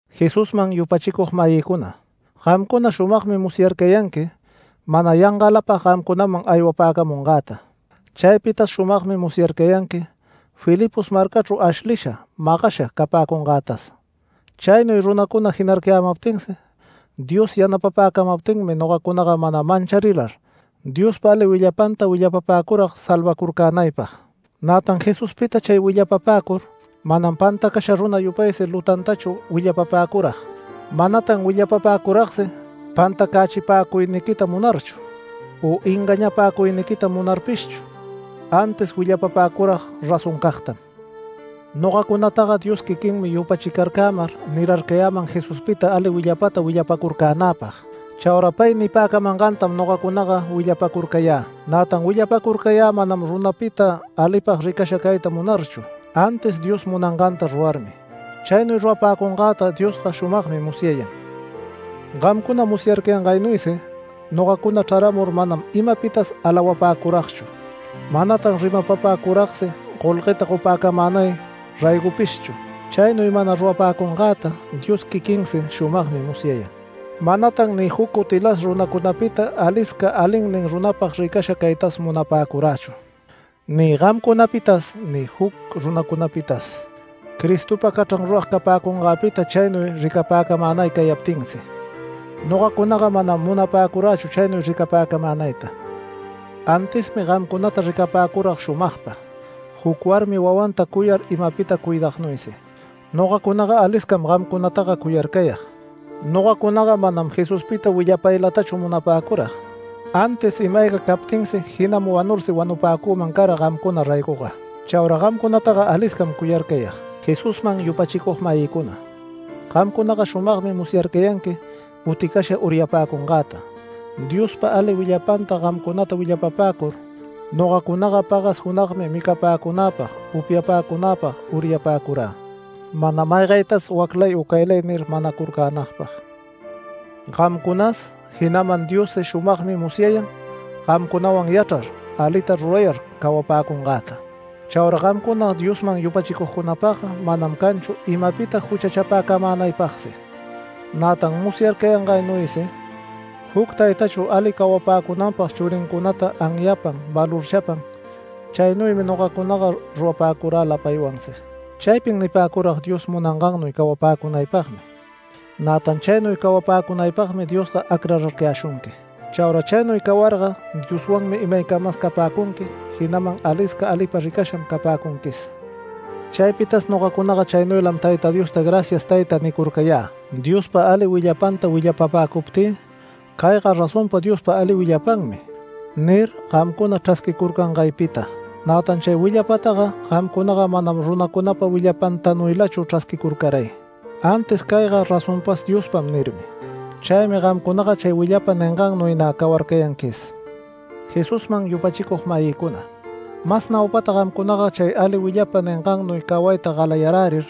Jesusman yupachicug-mayïcuna, gamcuna shumagmi musyarcayanqui, mana yangalapag gamcunaman aywapäcamungäta. Chaypitas shumagmi musyarcayanqui Filipos marcachru ashlisha, magasha capäcungätas. Chaynuy runacuna jinarcayämaptinsi Dios yanapapäcamaptinmi nogacunaga mana mancharilar, Diospa ali willapanta willapapäcurag salvacurcänaypag. Nätan Jesuspita chay willapapäcur manam pantacasha runa yupaysi lutantachu willapapäcurag. Manatan willapapäcuragsi pantacächipäcuyniquita munarchu, u engañapäcuyniquita munarpishchu, antis willapapäcurag razoncagtam. Nogacunataga Dios quiquinmi yupachicarcämar nirarcayäman Jesuspita ali willapata willapacurcänäpag. Chaura pay nipäcamangantam nogacunaga willapacurcayä. Nätan willapacurcayä manam runapita alipag ricasha cayta munarchu, antis Dios munanganta rurarmi. Chaynuy rurapäcungäta Diosga shumagmi musyayan. Gamcuna musyarcayangaynuysi nogacuna chraramur manam imapitas alawapäcuragchu. Manatan rimapapäcuragsi golgueta gopäcamänay raygopishchu. Chaynuy mana rurapäcungäta Dios quiquinsi shumagmi musyayan. Manatan ni juc cutilas runacunapita alisca alinnin runapag ricasha caytas munapäcurächu, ni gamcunapitas, ni juc runacunapitas. Cristopa cachran rurag capäcungäpita chaynuy ricapäcamänay cayaptinsi. Nogacunaga manam munapäcurächu chaynuy ricapäcamänayta. Antismi gamcunata ricapäcurag shumagpa, juc warmi wawanta cuyar imapita cuidagnuysi. Nogacunaga aliscam gamcunataga cuyarcayag. Nogacunaga manam Jesuspita willapaylatachu munapäcurag, antis ima-ayga captinsi, jinaman wanursi wanupäcüman cara gamcuna raygoga. Chaura gamcunataga aliscam cuyarcayag. Jesusman yupachicug-mayïcuna, gamcunaga shumagmi musyarcayanqui uticasha uryapäcungäta. Diospa ali willapanta gamcunata willapapäcur nogacunaga pagas junagmi micapäcunäpag upyapäcunäpag uryapäcurä mana maygaytas “Waclay u caylay” nir, manacurcänagpag. Gamcunas jinaman Diossi shumagmi musyayan gamcunawan yachrar, alita rurayar cawapäcungäta. Chaura gamcuna Diosman yupachicugcunapagga manam canchu imapita juchachapäcamänaypagsi. Nätan musyarcayangaynuysi juc taytachu ali cawapäcunanpag churincunata anyapan valorchapan, chaynuymi nogacunaga rurapäcurä lapaywansi. Chaypin nipäcurag Dios munangannuy cawapäcunaypagmi. Nätan chaynuy cawapäcunaypagmi Diosga acrarcayäshunqui. Chaura chaynuy cawarga Dioswanmi imaycamas capäcunqui, jinaman alisca alipa ricasham capäcunquis. Chaypitas nogacunaga chaynuylam Tayta Diosta “Gracias Tayta” nicurcayä, Diospa ali willapanta willapapäcuptï “Cayga razonpa Diospa ali willapanmi” nir, gamcuna chrasquicurcangaypita. Nätan chay willapataga gamcunaga manam runacunapa willapantanuylachu chrasquicurcaray, antis “Cayga razonpas Diospam” nirmi. Chaymi gamcunaga chay willapa ningannuy nä cawarcayanquis. Jesusman yupachicug-mayïcuna, mas naupata gamcunaga chay ali willapa ningannuy cawayta galayarärir,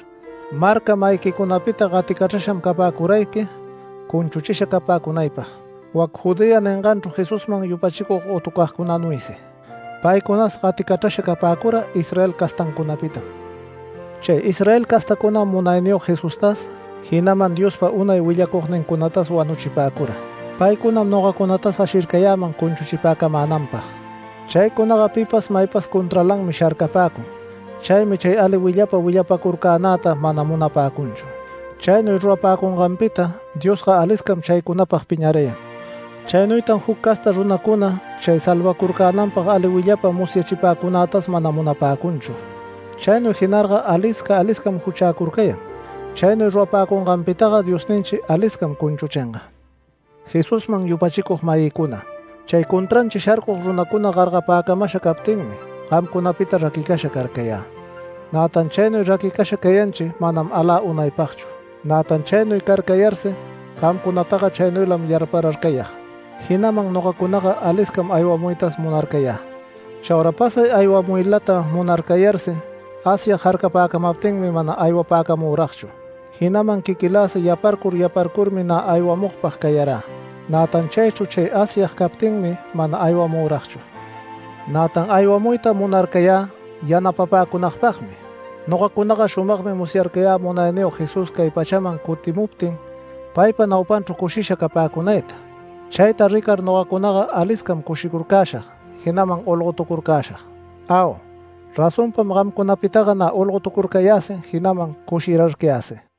marca-mayiquicunapita gaticachrasham capäcurayqui cunchuchisha capäcunaypag, wac Judea ninganchru Jesusman yupachicug gotucagcunanuysi. Paycunas gaticachrasha capäcura Israel castancunapitam. Chay Israel castacunam Munayniyog Jesustas, jinaman Diospa unay willacugnincunatas wanuchipäcura. Paycunam nogacunatas ashircayäman cunchuchipäcamänanpag. Chaycunaga pipas maypas contralanmi sharcapäcun, chaymi chay ali willapa willapacurcänäta mana munapäcunchu. Chaynuy rurapäcunganpita Diosga aliscam chaycunapag piñarayan. Chaynuytan juc casta runacuna chay salvacurcänanpag ali willapa musyachipäcunätas mana munapäcunchu. Chaynuy jinarga alisca aliscam juchäcurcayan. Chaynuy rurapäcunganpitaga Diosninchi aliscam cunchuchinga. Jesusman yupachicug-mayïcuna, chay contranchi sharcug runacuna gargapäcamasha captinmi gamcunapita raquicasha carcayä. Nätan chaynuy raquicasha cayanchi manam alä unaypagchu. Nätan chaynuy carcayarsi gamcunataga, chaynuylam yarpararcayag, jinaman nogacunaga aliscam aywamuytas munarcayä. Chaura pasay aywamuylata munarcayarsi Asyag jarcapäcamaptinmi, mana aywapäcamüragchu, jinaman quiquïlasi yaparcur yaparcurmi nä aywamugpag cayarä, nätan chaychru chay Asyag captinmi mana aywamüragchu. Nätan aywamuyta munarcayä yanapapäcunagpagmi. Nogacunaga shumagmi musyarcayä Munayniyog Jesús cay pachaman cutimuptin paypa naupanchru cushisha capäcunayta. Chayta ricar nogacunaga aliscam cushicurcäshag, jinaman olgotucurcäshag. Au, razonpam gamcunapitaga nä olgotucurcayäsi, jinaman cushirarcayäsi.